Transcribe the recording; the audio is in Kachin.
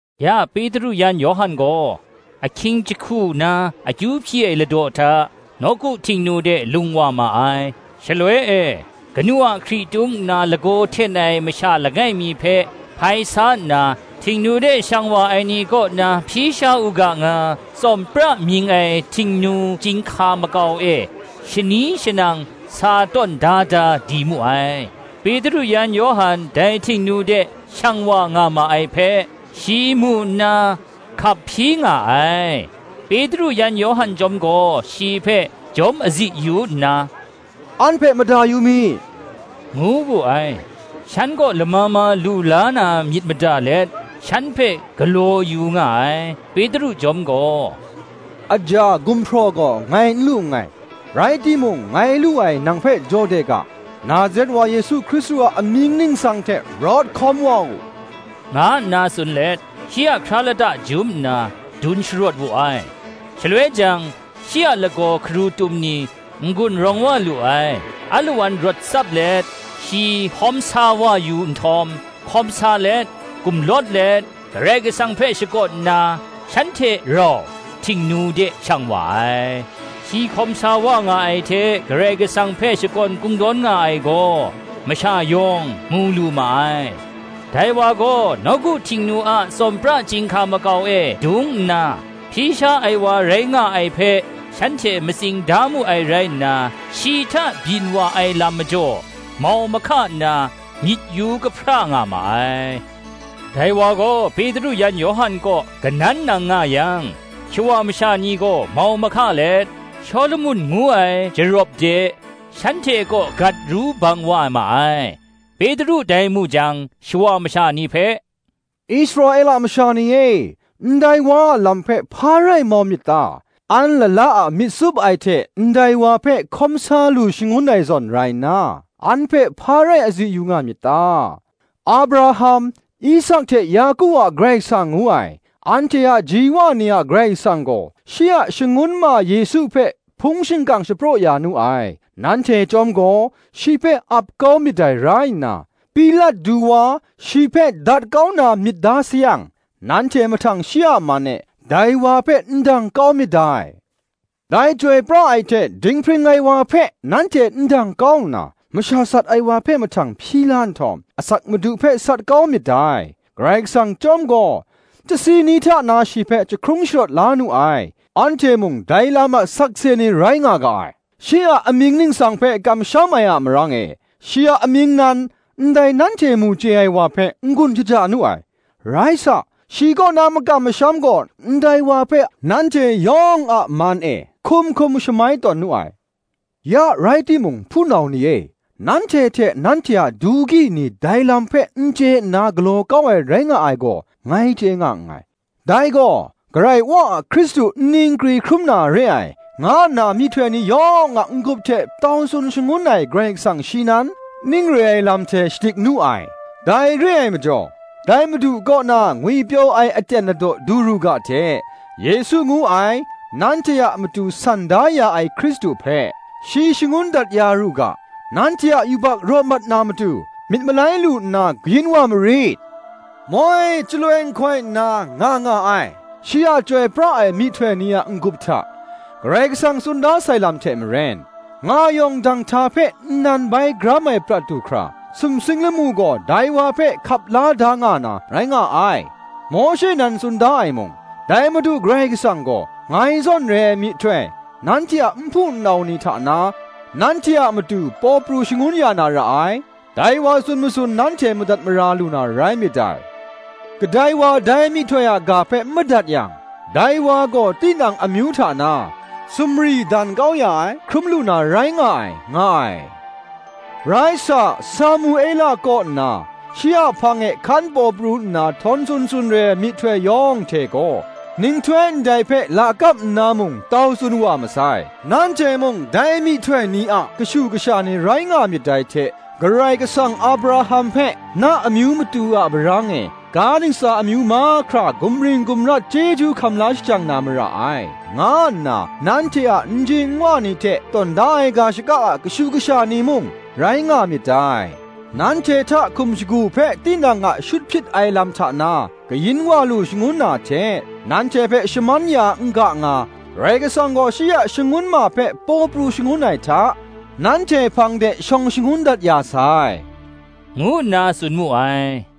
Ya Petru yan Yawhan gaw, ahkying jahku na akyu hpyi ai ladaw hta, nawku Htingnu de lung wa ma ai. Shaloi e, kanu a hkritung nna lagaw hten ai masha langai mi hpe hpai sa nna, Htingnu de shang wa ai ni kaw na hpyi sha u ga nga, Tsawm pra mying ai Htingnu chyinghka makau e shani shanang sa tawn da da di mu ai. Petru yan Yawhan dai Htingnu de shang wa nga ma ai hpe, shi mu nna hkap hpyi nga ai. Petru yan Yawhan chyawm gaw shi hpe jawm azi yu nna, “An hpe mada yu mi,” ngu wu ai. Shan kaw lama ma lu la na myit mada let, shan hpe galaw yu nga ai. Petru chyawm gaw, “Aja, gumhpraw gaw ngai n lu nngai, rai timung, ngai lu ai nang hpe jaw de ga: Nazaret wa Yesu Hkristu a amying ningsang hte rawt hkawm wa u,” nga nna tsun let, shi a hkra lata jum nna dun sharawt wu ai: shaloi jang, shi a lagaw hkarutum ni n-gun rawng wa lu ai. Alawan rawt tsap let shi hkawm sa wa yu nhtawm, hkawm sa let, gumlawt let, Karai Kasang hpe shakawn nna, shan hte rau Htingnu de shang wa ai. Shi hkawm sa wa nga ai hte Karai Kasang hpe shakawn kungdawn nga ai gaw, masha yawng mu lu ma ai: dai wa gaw nawku Htingnu a Tsawm pra chyinghka makau e dung nna, hpyi sha ai wa rai nga ai hpe shanhte matsing da mu ai rai nna, shi hta byin wa ai lam majaw, mau mahka nna myit yu kahpra nga ma ai. Dai wa gaw Petru yan Yawhan kaw kanan nang nga yang, shawa masha ni gaw mau mahka let, Shawlumon ngu ai jarawp de, shanhte kaw gat ru bang wa ma ai. Petru dai mu jang, shawa masha ni hpe, “Israela masha ni e, ndai wa a lam hpe hpa rai mau myit ta? an lala a myit tsup ai hte ndai wa hpe hkawm sa lu shangun ai zawn rai nna, an hpe hpa rai azi yu nga myit ta? Abraham, Isak hte Yaku a Karai Kasang ngu ai, anhte a ji wa ni a Karai Kasang gaw, shi a Shangun ma Yesu hpe hpung shingkang shapraw ya nu ai: nanhte chyawm gaw shi hpe ap kau myit dai rai nna, Pilat du wa, shi hpe dat kau na myit da sayang, nanhte mahtang shi a man e dai wa hpe ndang kau myit dai. Dai chyoi pra ai hte dinghpring ai wa hpe nanhte ndang kau nna, masha sat ai wa hpe mahtang hpyi la nhtawm, asak Madu hpe sat kau myit dai; Karai Kasang chyawm gaw, chyasi ni hta na shi hpe jahkrung sharawt la nu ai: anhte mung dai lam a sakse ni rai nga ga ai. Shi a amying ningsang hpe kamsham ai a marang e, shi a amying nan, ndai nanhte mu chye ai wa hpe n-gun shaja nu ai; rai sa, shi kaw na makam masham gaw, ndai wa hpe, nanhte yawng a man e, hkum hkum shamai tawn nu ai. Ya rai timung, hpunau ni e, nanhte hte nanhte a du gyi ni dai lam hpe n chye nna galaw kau ai rai nga ai gaw, ngai chye nga nngai. Dai gaw, Karai Wa a Hkristu nni nkri hkrum na re ai, nga nna myihtoi ni yawng a n-gup hte tau tsun shangun ai Karai Kasang shi nan, ning re ai lam hte shadik nu ai. Dai re ai majaw, dai Madu kaw na ngwipyaw ai aten ladaw du ru ga hte, Yesu ngu ai, nanhte a matu san da ya ai Hkristu hpe, shi shangun dat ya ru ga, nanhte a yubak raw mat na matu, myit malai lu nna kayin wa marit; moi chyaloi nhkoi nna nga nga ai, shi a chyoi pra ai myihtoi ni a n-gup hta, Karai Kasang tsun da sai lam hte maren, nga yawng danghta hpe nnan bai gram ai prat du hkra, sumsing lamu gaw dai wa hpe hkap la da nga na, rai nga ai. Mawshe nan tsun da ai mung, Dai Madu Karai Kasang gaw, ngai zawn re ai myihtoi, nanhte a nhpu nnau ni hta na, nanhte a matu paw pru shangun ya na ra ai: dai wa tsun matsun nanhte madat mara lu na rai myit dai. Kadai wa dai myihtoi a ga hpe n madat yang, dai wa gaw tinang amyu hta na sumri dan kau ya ai hkrum lu na rai nga ai, nga ai. Rai sa, Samuela kaw nna, shi a hpang e hkan paw pru nna htawn tsun tsun re ai myihtoi yawng hte gaw, nhtoi ndai hpe lakap nna mung tau tsun wa masai. Nanhte mung dai myihtoi ni a kashu kasha ni rai nga myit dai hte, Karai Kasang Abraham hpe, Na amyu matu a marang e ga ntsa amyu mahkra gumring gumrat chyeju hkam la shajang na mara ai, nga nna nanhte a nji nwa ni hte tawn da ai ga shaka a kashu kasha ni mung, rai nga myit dai. Nanhte hta hkum shagu hpe tinang a shut hpyit ai lam hta na kayin wa lu shangun na hte, nanhte hpe shaman ya n ga nga, Karai Kasang gaw shi a Shangun ma hpe paw pru shangun ai hta, nanhte hpang de shawng shangun dat ya sai,” ngu nna tsun mu ai.